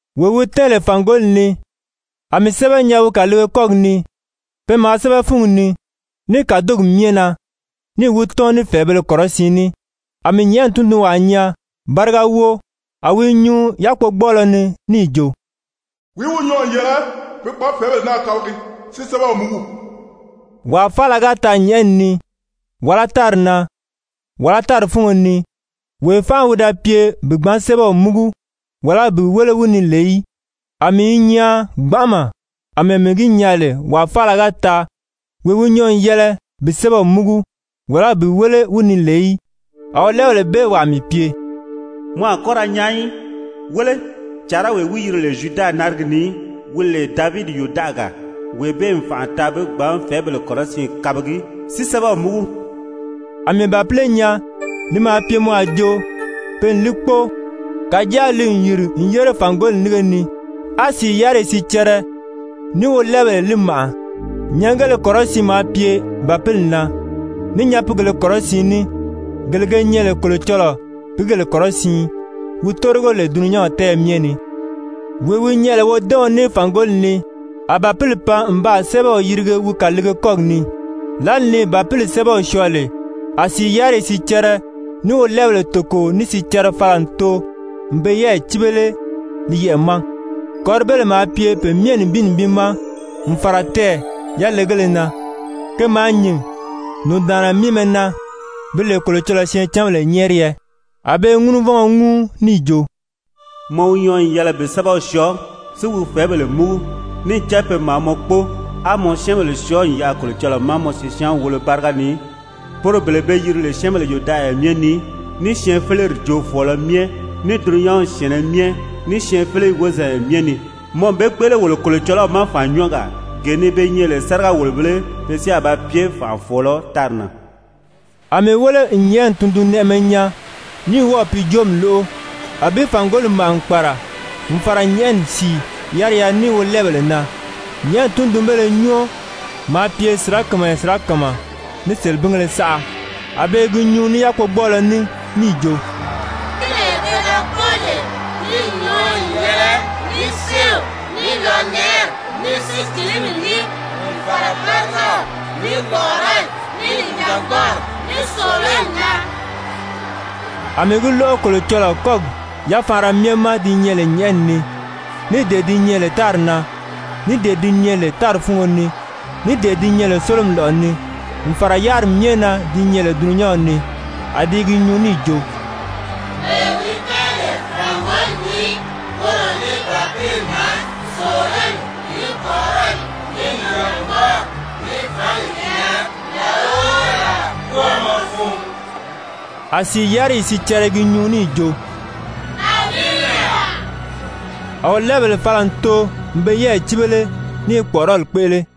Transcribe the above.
Wee wi tɛ́ɛn lè fàngoli ni, a mii sɛ́bɛ nyaa wi kàliige kɔ́gi ni, pe maa sɛ́bɛ fúngi ni ní kàdogi myɛ na níì wi tɔ́n ní fɛ̀ɛbēle kɔrɔsiin ní. A mii nyɛ̀ʔɛni tundunwaa nyaa, báriga wóo, a wi i nyuu yákpogbɔɔlɔ ni níì jo: «Wìí wi nyɔɔ n yɛlɛ bi gbǎn fɛ̀ɛ́bèle naa kabagi, si sɛ́bɛw múgu?» Wàa faala ga taa nyɛ̀ʔɛni ni, wàlá tári na, wàlá tári fúngo ni, wee fánʔa wi da pye bi gbǎn sɛ́bɛw múgu, wàlá bi wéle wi ni lè í. A mii i nyaan gbanʔama àmɛɛ mii gi nyaa lè wàa faala ga taa, wee wi nyɔɔ n yɛlɛ bi sɛ́bɛw múgu, wàlá bi wéle wi ni lè í. A wolɛɛbèle bee wàa mii pye: «Mɔ a kɔ́ ra nyaan í. Wéle, càarawee wi yiri lè Zyuda narigi ni, wi lè Davidi yòdaʔaga, wee bee n fànʔa taa bi gbǎn fɛ̀ɛ́bèle kɔrɔsiin kabagi si sɛ́bɛw múgu.» A mii bàpile nyaa, li maa pye mɔ a jo pe n li kpóo, kàjáa li n yìri n yére fàngoli nínge ni, á sìi yáriyi sicɛrɛ, ní wolɛɛbèle li màʔa. Nyɛngéle kɔrɔsiin maa pye Bàpili na, ní nyapiigèlē kɔrɔsiin ní, gele ge nyɛ lè Kolocɔlɔɔ pìígèle kɔrɔsiin wi tórigo lè dulunyanw tɛ́ɛyɛ myɛ ni. Wee wi nyɛ lè wodɛ́ɛɔn ní fàngoli ni, a Bàpili pan n baa sɛ́bɛw yirige wi kàliige kɔ́gi ni. Lǎli ni Bàpili sɛ́bɛw syɔɔ lè, a sìi yáriyi sicɛrɛ ní wolɛɛbèle toko ní sicɛrɛ fala n too n pe yɛ́ɛyi cíbele li yɛʔɛ̀ ma, kɔ̀ríbéle maa pye pe myɛ nibin nibin ma n fàra tɛɛ̀ yalegéle na, ke maa nyìn nùndaanna míimɛ na bi lè Kolocɔlɔɔ syɛɛncanbèle nyɛ́ɛriyɛ. A be i ŋúnuvɔngɔ ŋúu níì jo: «Mɔ wi nyɔɔ n yɛlɛ bi sɛ́bɛw syɔɔ, si wi fɛ̀ɛ́bèle múgu, níì cán pe maa mɔ kpóo, á mɔ syɛ́ɛnbèle syɔɔ n yaʔa Kolocɔlɔɔ ma mɔ sisyaanw wolo báriga ni, poro bele be yiri lè syɛ́ɛnbèle yòdaʔaya myɛ ni, ní syɛɛnfeleri joofɔɔlɔ myɛ, ní dulunyanw syɛ̀ɛnnɛ myɛ, syɛɛnfeleyi wozanya myɛ ni. Mɔ n be kpéʔele wolo Kolocɔlɔw ma fànnyɔɔgaa, gee ni be nyɛ lè sáriga-wòlobēle, pe si a ba pye fànʔafɔɔlɔ tári na.» A mii wéle n nyɛ̀ʔɛni tundunnɛʔɛmɛ nyaa, ní wɔ́ɔ̀ pi joomi lóʔo, a bi fàngoli màʔa n kpàra, n fàra nyɛ̀ʔɛni sìi yáriya ní wolɛɛbèle na, nyɛ̀ʔɛni tundunbéle nyɔɔ maa pye sirakamayɛ sirakama ní selebingéle saʔa. A be i gi nyuu ní yákpogbɔɔlɔ ní níì jo: «Bàpilee pe da kpóo lè, li n nyɔɔ n yɛlɛ ní séew, ní lɔnɛʔɛri, ní sícilimi ní, n fàra bárigaw, ní kpɔ̀ʔɔrɔli, ní nìjangbɔɔri, ní sòololi na.» A mii gi lóʔo Kolocɔlɔɔ kɔ́gi yafaanra myɛ ma di nyɛ lè nyɛ̀ʔɛni ni, ní dee di lè tári na, ní dee di lè tári fúngo ni, ní dee di lè sólomi lɔ̀ʔɔ ni, n fàra yáriri myɛ na di nyɛ lè dulunyanw ni, a di i gi nyuu níì jo: «Wee wi tɛ́ɛn lè fàngoli ni, woro ní Bàpili na sòololi, ní kpɔ̀ʔɔrɔli, ní nìjangbɔɔri, ní fǎngi yɛlɛ làla o làla kwɔ́ɔmɔ fun!» A sìi yáriyi sicɛrɛ i gi nyuu níì jo: «Amiina!» A wolɛɛbèle fala n too n pe yɛ́ɛyi cíbele ní i kpɔ̀ʔɔrɔli kpéʔele.